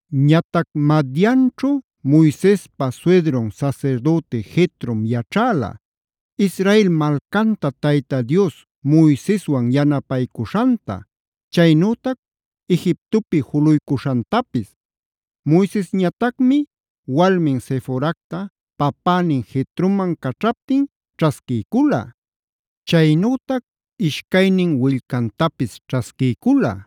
Ñatac Madianćhu Moisespa suydrun sasirdüti Jetrom yaćhäla: Israel malcanta Tayta Dios Moiseswan yanapaycuśhanta, chaynütac Egiptopi juluycuśhantapis. Moisesñatacmi walmin Seforacta papänin Jetroman caćhaptin ćhasquiycula.a Chaynütac ishcaynin willcantapis ćhasquiycula;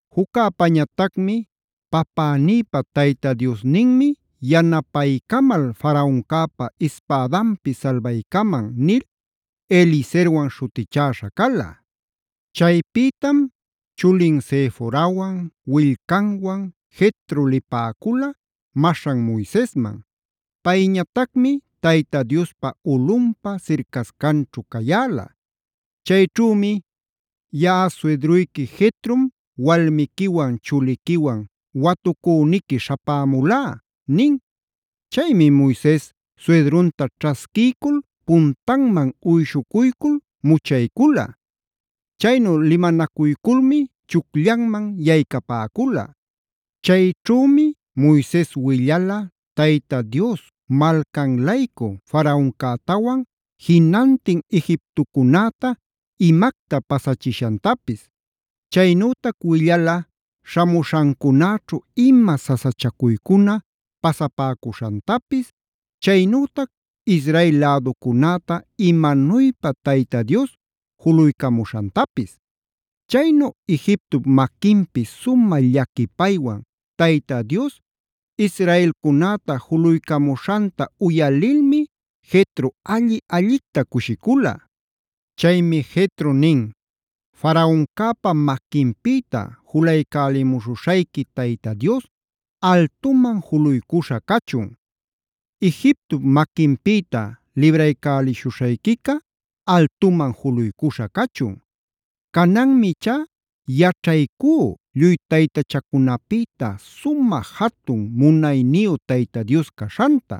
Juccäpañatacmi “papänïpa Tayta Diosninmi yanapaycamal Faraoncäpa ispädanpi salbaycaman” nil Eliezerwan śhutichäśha cala. Chaypïtam chulin Seforawan, willcanwan Jetro lipäcula maśhan Moisesman. Payñatacmi Tayta Diospa ulꞌunpa sircascanćhu cayäla. Chayćhümi: “Yaꞌa suydruyqui Jetrom walmiquiwan chuliquiwan watucüniqui śhapämulá” nin. Chaymi Moises suydrunta ćhasquiycul puntanman uyshucuycul muchaycula. Chaynu limanacuyculmi chucllanman yaycapäcula. Chayćhümi Moises willala Tayta Dios malcan-laycu Faraoncätawan jinantin Egiptocunäta imacta pasachishantapis. Chaynütac willala śhamuśhancunäćhu ima sasachacuycuna pasapäcuśhantapis, chaynütac Israel läducunäta imanuypa Tayta Dios juluycamuśhantapis. Chaynu Egiptop maquinpi sumä llaquipaywan Tayta Dios israelcunäta julaycamuśhanta uyalilmi Jetro alli-allicta cushicula. Chaymi Jetro nin: “Faraoncäpa maquinpïta julaycälimuśhushayqui Tayta Dios altuman juluycuśha cachun. Egiptop maquinpïta libraycäliśhuśhayquica altuman juluycuśha cachun. Cananmi ichá yaćhaycú lluy taytachacunapïta sumä jatun munayniyu Tayta Dios caśhanta.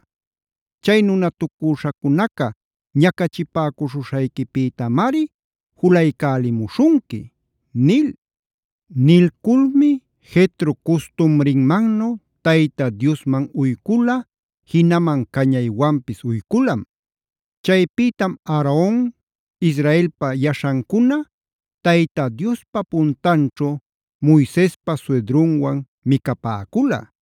Chay nunatucüśhacunaca ñacachipäcuśhuśhayquipïtamari julaycälimuśhunqui” nil. Nilculmi Jetro custumrinmannu Tayta Diosman uycula, jinaman cañaywanpis uyculam. Chaypïtam Aaron, Israelpa yaśhancuna Tayta Diospa puntanćhu Moisespa suydrunwan micapäcula.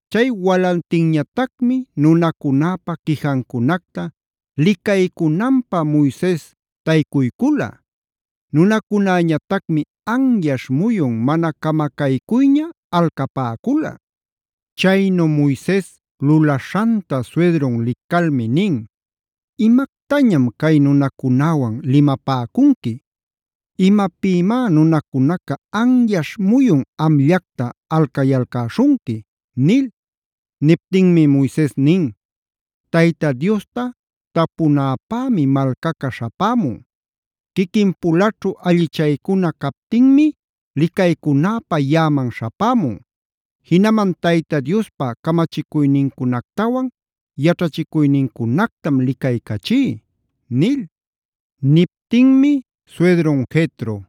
Chay walantinñatacmi nunacunäpä quijancunacta licaycunanpä Moises taycucuycula. Nunacunäñatacmi anyaśh muyun mana camacaycuyña alcapäcula. Chaynu Moises lulaśhanta suydrun licalmi nin: “¿Imactañam cay nunacunäwan limapäcunqui? ¿Imapïmá nunacunaca anyaśh muyun amllacta alcayalcäśhunqui?” nil. Niptinmi Moises nin: “Tayta Diosta tapunäpämi malcaca śhapämun. Quiquin-pulaćhu allichaycuna captinmi licaycunäpä yaꞌaman śhapämun. Jinaman Tayta Diospa camachicuynincunactawan yaćhachicuynincunactam licaycachí” nil. Niptinmi suydrun Jetro: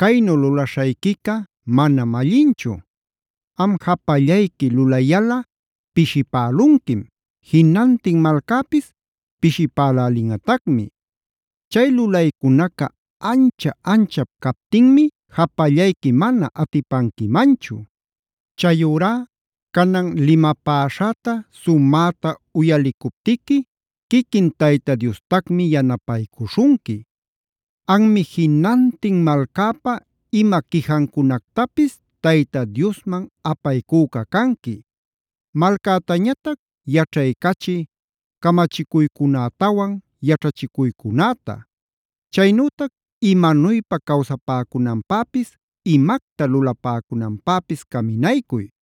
“Caynu lulaśhayquica manam allinchu. Am japallayqui lulayalꞌa pishipälunquim; jinantin malcäpis pishipälälinꞌatacmi. Chay lulaycunaca ancha-anchap captinmi japallayqui mana atipanquimanchu. Chayurá canan limapäśhäta sumäta uyalicuptiqui quiquin Tayta Diostacmi yanapaycuśhunqui. Anmi jinantin malcäpa ima quijancunactapis Tayta Diosman apaycüca canqui. Malcätañatac yaćhaycachiy camachicuycunätawan yaćhachicuycunäta. Chaynütac imanuypa cawsapäcunanpäpis, imacta lulapäcunanpäpis caminaycuy.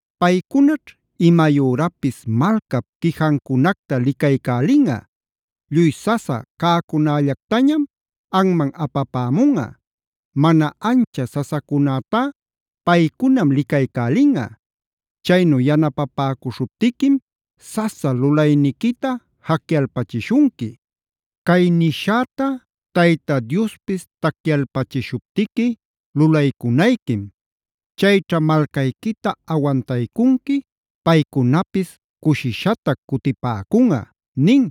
Paycunaćh imayürapis malcap quijancunacta licaycälinꞌa. Lluy sasa cäcunallactañam anman apapämunꞌa; mana ancha sasacunätá paycunam licaycälinꞌa. Chaynu yanapapäcuśhuptiquim sasa lulayniquita jacyalpachishunqui. Cay nishäta Tayta Diospis tacyalpachishuptiqui lulaycunayquim. Chayćha malcayquita awantaycunqui; paycunapis cushishatac cutipäcunꞌa” nin.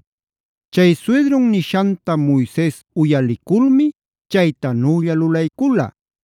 Chay suydrun nishanta Moises uyaliculmi chaytanülla lulaycula.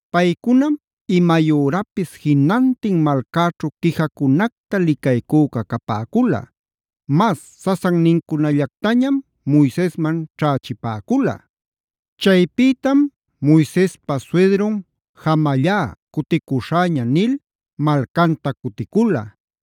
Paycunam imayürapis jinantin malcäćhu quijacunacta licaycüca capäcula. Mas sasannincunallactañam Moisesman ćhächipäcula. Chaypïtam Moisespa suydrun “jamallá, cuticuśhäña” nil malcanta cuticula.